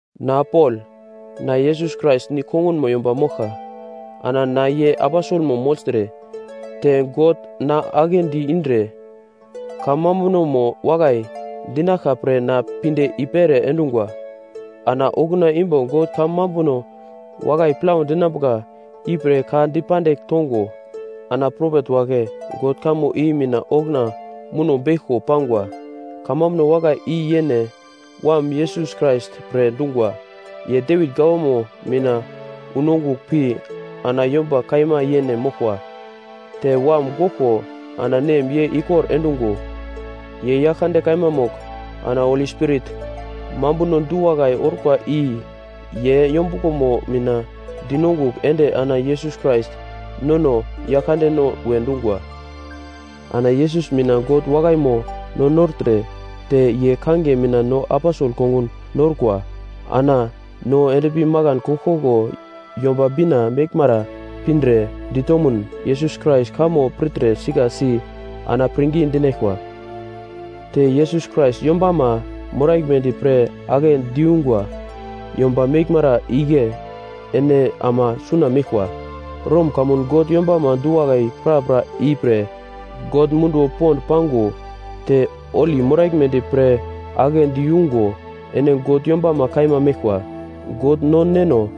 Na Pol, na Yesus Krais nigl kongunmo yomba moglka. Ana na ye aposelmo mogltre, te God na aglendi indre kamambunomo wakai dinaglka pre na pinde i-pere endungwa. Ana okuna imbo God kamambuno wakai plau dinambuka ipre ka dipandigl tongo, ana propet wagle God kamo i mina okuna muno beglko pangwa. Kamambuno wakai i yene Wam Yesus Krais pre dungwa, ye Devit gawama mina unongugl pi ana yomba kaima yene moglkwa. Te wam goglko ana Nem ye ikor endungo, ye Yaglkande kaima mogl ana Holi Spirit mambuno du-wakai orkwa i ye yombuglomo mina dinongugl ende ana Yesus Krais nono Yaglkandeno we dungwa. Ana Yesus mina God wakaimo no nortre te ye kangiye mina no aposel kongun norkwa ana no endpi makan koglkoglo Yomba Bina meglmara pindre ditomun Yesus Krais kamo pirtre sika si ana pirngi dinaglkwa. Te Yesus Krais yombama moraglmedi pre agle diyungwa yomba meglmara igle ene ama suna meglkwa. Rom kamun God yombama du-wakai prapra ipre God munduwo pond pango te holi moraglmedi pre aglendi yungo ene God yombama kaima meglkwa. God no Neno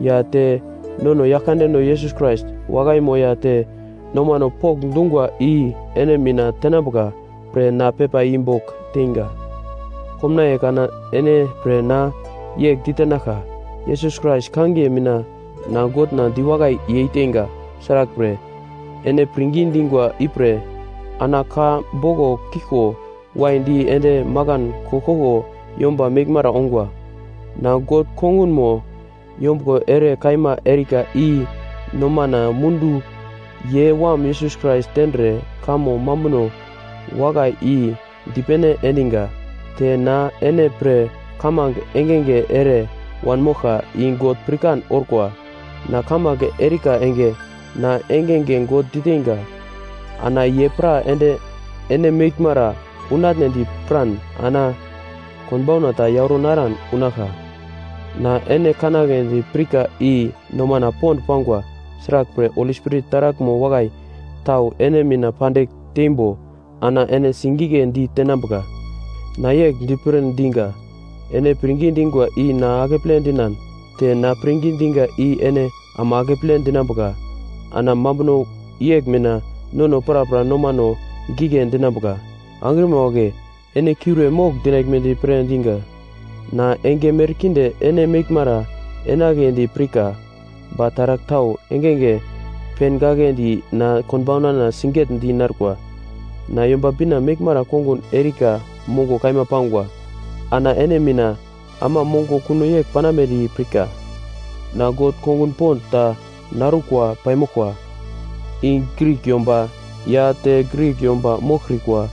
ya te nono Yaglkandeno Yesus Krais wakaimo ya te nomano pokndungwa i ene mina tenambuka pre na pepa i bogl teinga. Komnaiye kana ene pre na yegl ditenaglka, Yesus Krais kangiye mina na Godna diwakai yeiteinga. Sraglpre, ene pirngi dingwa ipre ana ka boglo kiglko waidi ende makan koglkoglo yomba meglmara ongwa. Na God kongunmo yombuglo ere kaima erika i nomana mundu ye wam Yesus Krais tendre kamo mambuno wakai i dipene endiga. Te na ene pre kamange engenge ere wanmoglka i God pirkan orkwa. Na kamange erika enge, na engenge God diteinga. Ana ye pra ende ene meglmara unatnedi piran ana konbauna ta yauro naran unaglka. Na ene kanagledi pirka i nomana pond pangwa. Sraglpre, Holi Spirit taraglmo wakai tau ene mina pandigl teimbo ana ene sigigledi tenambuka. Na yegl dipir dinga. Ene pirngi dingwa i na akeple dinan te na pirngi dinga i ene ama akeple dinambuka ana mambuno yegl mina nono prapra nomano gigle dinambuka. Angrima wagle, ene kiure mogl dinaglmedi pre dinga. Na enge merkinde ene meglmara enagledi pirka, ba taragl tau engenge pengagledi na konbaunana sigetdi narkwa. Na Yomba Bina meglmara kongun erika mongo kaima pangwa, ana ene mina ama mongo kuno yegl panambedi pirka. Na God kongun pond ta narukwa paimoglkwa. I Grik yomba ya te Grik yomba moglkrikwa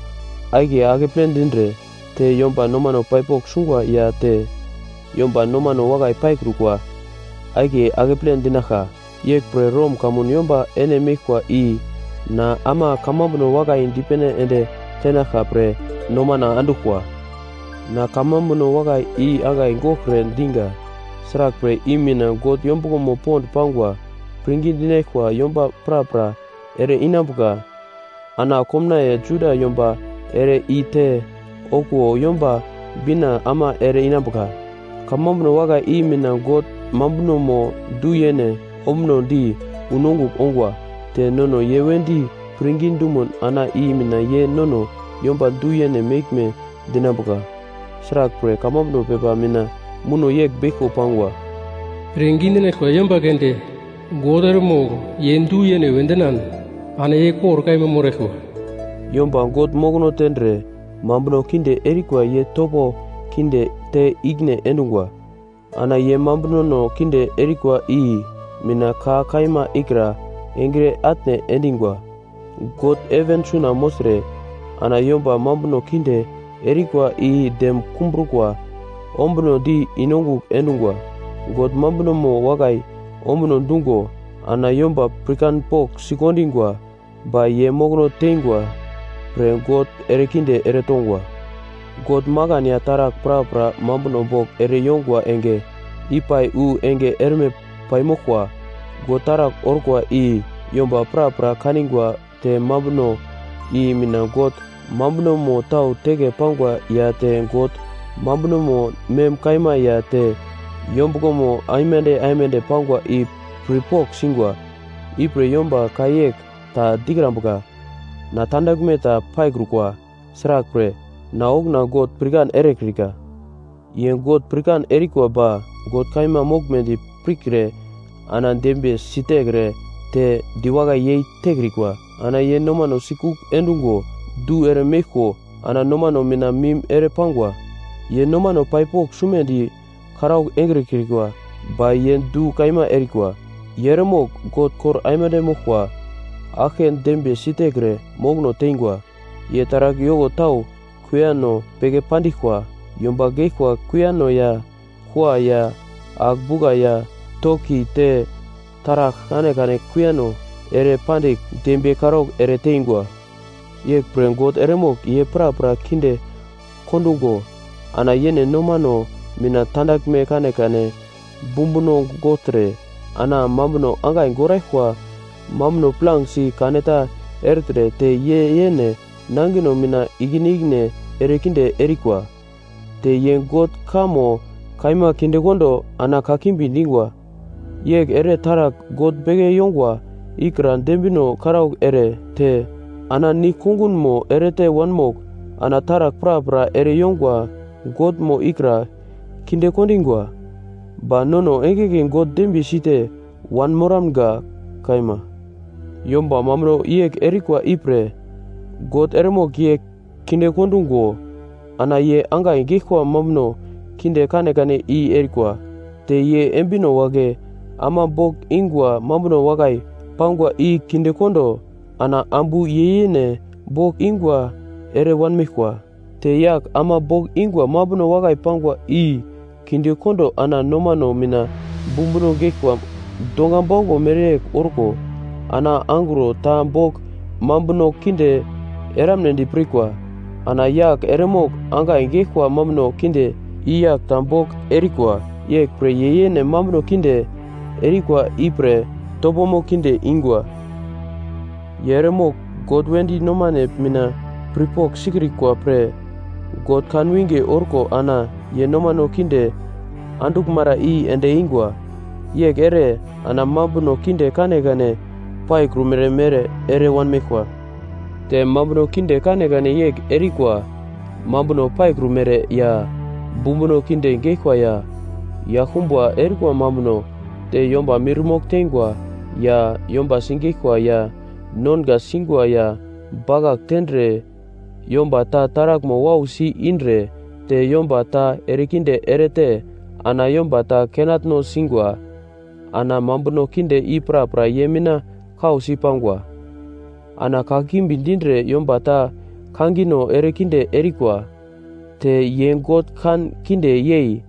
akiye akeple dindre, te yomba nomano pai pogl sungwa ya te yomba nomano wakai paikrukwa akiye akeple dinaglka. Yeglpre Rom kamun yomba ene meglkwa i na ama kamambuno wakai dipene ende tenaglka pre nomana anduglkwa. Na kamambuno wakai i angai goglkre dinga. Sraglpre, i mina God yombuglomo pond pangwa. Pirngi dinaglkwa yomba prapra ere-inambuka, ana komnaiye Juda yomba ere-i te okuwo Yomba Bina ama ere-inambuka. Kamambuno wakai i mina God mambunomo du-yene ombunodi unongugl ongwa. Te nono ye wedi pirngi dumun ana i mina ye nono yomba du-yene meglme dinambuka. Sraglpre, kamambuno pepa mina muno yegl beglko pangwa, “Pirngi dinaglkwa yomba keunde God eremogl ye du-yene we dinan ana ye kor kaima moraglkwa.” Yomba God mokono tendre mambuno kinde erikwa ye topo kinde te ikine endungwa. Ana ye mambunono kinde erikwa i mina ka kaima ikra engre atne endingwa. God heven suna mogltre, ana yomba mambuno kinde erikwa i dem kumbrukwa ombunodi i-nongugl endungwa. God mambunomo wakai ombuno dungo ana yomba pirkanpogl sikondingwa ba ye mokono teingwa pre God erekinde ere tongwa. God makan ya taragl prapra mambuno bogl ere yongwa enge ipai wu enge erme paimoglkwa. God taragl orkwa i yomba prapra kaningwa te mambuno i mina God mambunomo tau teke pangwa ya te God mambunomo mem kaima ya te yombuglomo aimande aimande pangwa i pirpogl singwa. Ipre yomba ka yegl ta dikrambuka, “Na tandaglme ta paikrukwa. Sraglpre, na okuna God pirkan erekrika.” Ye God pirkan erikwa ba God kaima moglmedi pirkre ana dembiye sitekre, te diwakai yei tekrikwa, ana ye nomano sikugl endungo du ere meglko ana nomano mina mim ere pangwa. Ye nomano pai pogl sumedi karaugl engrikwa ba ye du kaima erikwa. Ye eremogl God kor aimande moglkwa aglke dembiye sitekre mokono tengwa. Ye taragl yoko tau kuiyano beke pandiglkwa: Yomba geglkwa kuiyano ya kua ya agl-bugla ya toki te taragl kanekane kuiyano ere pandigl dembiye karaugl ere teingwa. Yeglpre God eremogl ye prapra kinde kondungo ana yene nomano mina tandaglme kanekane bumbuno gogltre, ana mambuno angai goraglkwa mambuno plangesi kaneta ertre te ye yene nangino mina ikine ikine erekinde erikwa. Te ye God kamo kaima kindekondo ana kakimbi dingwa. Yegl ere taragl god beke yongwa ikra dembino karaugl ere te ana nigl kongunmo erete wanmogl ana taragl prapra ere yongwa Godmo ikra kinde kondingwa. Ba nono engenge God dembiye site wanmoramga. Kaima. Yomba mambuno yegl erikwa ipre, God eremogl ye kinde kondungo ana ye angai geglkwa mambuno kinde kanekane i erikwa. Te ye embino wagle ama bogl ingwa mambuno wakai pangwa i kinde kondo ana ambu ye yene bogl ingwa ere wanmeglkwa. Te yagl ama bogl ingwa mambuno wakai pangwa i kinde kondo ana nomano mina bumbuno geglkwa donga bauglo mereyegl orko ana angro ta bogl mambuno kinde eramnedi pirkwa. Ana yagl eremogl angai geglkwa mambuno kinde i yagl ta bogl erikwa, yeglpre ye yene mambuno kinde erikwa ipre topomo kinde ingwa. Ye eremogl God wedi nomane mina pirpogl sikrikwa pre, God kan winge orko ana ye nomano kinde anduglmara i ende eingwa. Yegl ere, ana mambuno kinde kanekane paikrumere mere ere wanmeglkwa. Te mambuno kinde kanekane yegl erikwa, mambuno paikrumere, ya bumbuno kinde geglkwa, ya yaglkumba erikwa mambuno. Te yomba mirmogl teingwa ya yomba sigeglkwa ya nonga singwa ya bakagl tendre yomba ta taraglmo wausi indre te yomba ta erekinde erete ana yomba ta kenatno singwa. Ana mambuno kinde i prapra ye mina kausi pangwa. Ana kakimbi dindre yomba ta kangino ere kinde erikwa. Te ye God kan kinde yei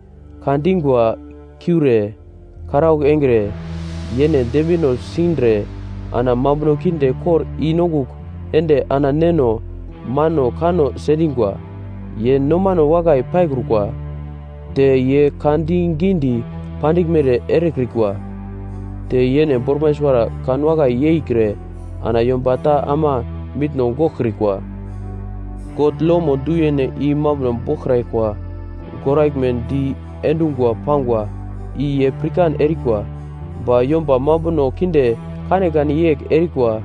ka dingwa kiure, karaugl engre, yene dembino sindre ana mambuno kinde kor i-nongugl ende ana neno mano kanno sendingwa. Ye nomano wakai paikrukwa, te ye ka di gidi pandiglmere erekrikwa, te yene bormai suwara kan wakai yeikre ana yomba ta ama mitno goglkrikwa. God lomo du-yene i mambuno boglkraglkwa goraglme di endungwa pangwa i ye pirkan erikwa, ba yomba mambuno kinde kanekane yegl erikwa.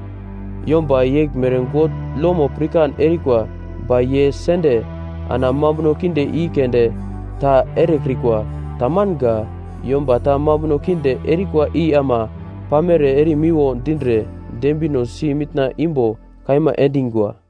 Yomba yeglmere God lomo pirkan erikwa ba ye sende ana mambuno kinde i keunde ta erekrikwa. Tamanga. Yomba ta mambuno kinde erikwa i ama pamere erimiwo dindre dembinosi mitna imbo kaima endingwa.